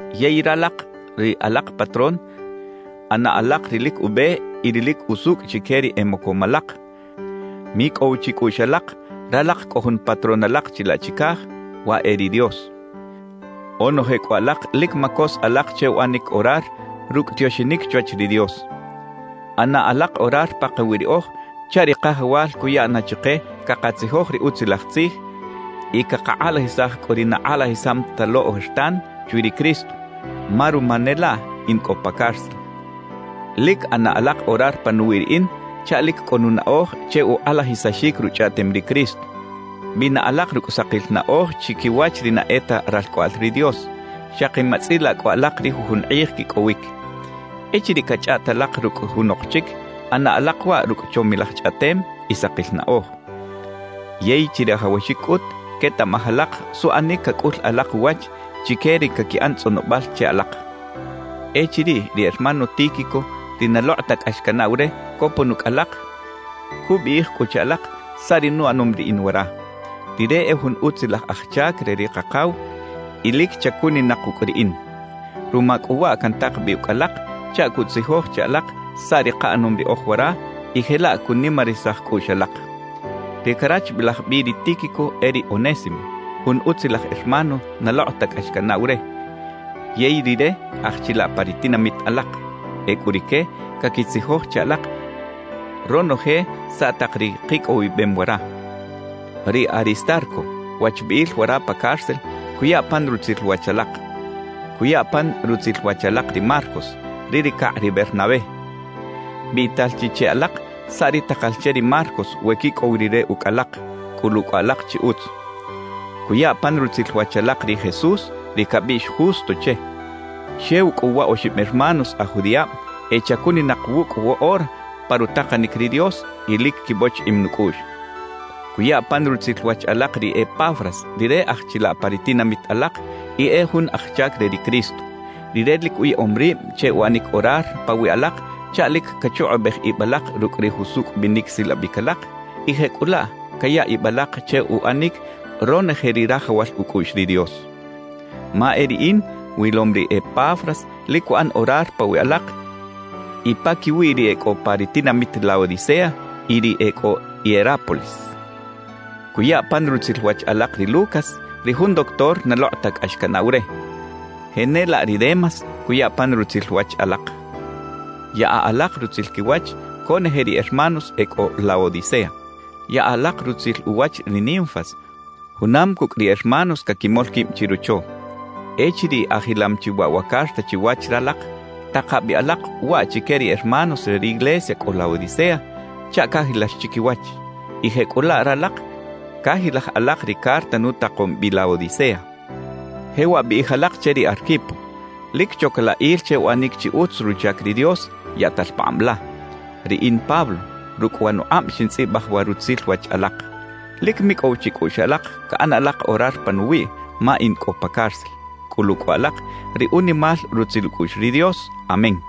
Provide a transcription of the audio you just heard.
Yey ralak ri alak patrón, ꞌana alak ri lic ube y ri lic usucꞌ chique ri e mocom alak; micꞌow chicꞌuꞌx alak, ralak cꞌo jun “Patrón” alak chilaꞌ chicaj, waꞌ e ri Dios. Onoje cꞌu alak lic macos alak che uꞌanic orar rucꞌ tioxinic chwach ri Dios. ꞌAna alak orar pakawi riꞌoj chaꞌ ri Kajawal cuya na chike cakatzijoj ri Utzilaj Tzij y cakakꞌalajisaj cꞌu ri na kꞌalajisam ta lo ojertan chwi ri Cristo, ma ruma ne laꞌ in cꞌo pa cárcel. Lic ꞌana alak orar panuwiꞌ riꞌin chaꞌ lic cꞌo nunaꞌoj che ukꞌalajisaxic Ruchꞌaꞌtem ri Cristo. Bina alak rucꞌ sakil naꞌoj chiquiwach ri na e ta ralcꞌoꞌal ri Dios, xaki matzꞌilaꞌ cꞌu alak ri jujun kꞌij quicꞌowic. Echiriꞌ cachꞌaꞌt alak rucꞌ junok chic, ꞌana alak waꞌ rucꞌ chomilaj chꞌaꞌtem y sakil naꞌoj. Yey chirajawaxic cꞌut quetaꞌmaj alak suꞌanic cacꞌul alak uwach chique ri caquiꞌan tzꞌonobal che alak. Echiriꞌ ri hermano Tíquico ri na lokꞌ ta cꞌax canaꞌw re copon ucꞌ alak, cubiꞌij cꞌu che alak saꞌ ri nuꞌanom riꞌin wara. Rire e jun utzilaj aj chac re ri Kakaw y lic chacuninak wucꞌ riꞌin. Ruma cꞌu waꞌ cantak bi ucꞌ alak chaꞌ cutzijoj che alak saꞌ ri kaꞌanom riꞌoj wara y jelaꞌ cunimarisaj cꞌuꞌx alak. Ri carachbilaj bi ri Tíquico e ri Onésimo, jun utzilaj hermano na lokꞌ ta cꞌax canaꞌw re, yey rire aj chilaꞌ pa ri tinamit alak. Ecꞌu rique caquitzijoj che alak ronoje saꞌ tak ri kicꞌowibem wara. Ri Aristarco, wachbiꞌil wara pa cárcel, cuya pan rutzil wach alak; cuya pan rutzil wach alak ri Marcos, ri ricakꞌ ri Bernabé. Biꞌtal chi che alak saꞌ ri takal che ri Marcos we quicꞌow rire ucꞌ alak; cꞌulu cꞌu alak chi utz. Cuya pan rutzil wach alak ri Jesús, ri cabiꞌx Justo che. Xew cꞌu wa oxib hermanos aj judiꞌab e chacuninak wucꞌ woꞌora pa rutakanic ri Dios y lic quibochiꞌim nucꞌuꞌx. Cuya pan rutzil wach alak ri Epafras, rire aj chilaꞌ pa ri tinamit alak y e jun aj chac re ri Cristo. Rire lic uyaꞌom rib che uꞌanic orar pawiꞌ alak chaꞌ lic cachukꞌubej ib alak rucꞌ ri jusucꞌ binic silabic alak y jecꞌulaꞌ caya ib alak che uꞌanic ronoje ri rajawal ucꞌuꞌx ri Dios. Ma e riꞌin wilom ri Epafras lic cuꞌan orar pawiꞌ alak y paquiwiꞌ ri e cꞌo pa ri tinamit Laodicea y ri e cꞌo Hierápolis. Cuya pan rutzil wach alak ri Lucas, ri jun doctor na lokꞌ ta cꞌax canaꞌw re; jenelaꞌ ri Demas cuya pan rutzil wach alak. Yaꞌa alak rutzil quiwach conoje ri hermanos e cꞌo Laodicea. Yaꞌa alak rutzil uwach ri Ninfas junam cucꞌ ri hermanos caquimol quib chirocho. Echiriꞌ ajilam chi waꞌ wa carta chiwach ralak, taka bi alak waꞌ chique ri hermanos re ri iglesia cꞌo Laodicea chaꞌ cajilax chiquiwach; y jecꞌulaꞌ ralak cajilaj alak ri carta nutakom bi Laodicea. Jewaꞌ biꞌij alak che ri Arquipo: «Lic choc la il che uꞌanic chi utz ruchac ri Dios yaꞌtal pakꞌab la.» Riꞌin Pablo, rucꞌ wa nukꞌab xintzꞌibaj wa rutzil wach alak. Lic micꞌow chicꞌuꞌx alak caꞌan alak orar panuwiꞌ ma in cꞌo pa cárcel. Cꞌulu cꞌu alak ri unimal rutzil ucꞌuꞌx ri Dios. Amén.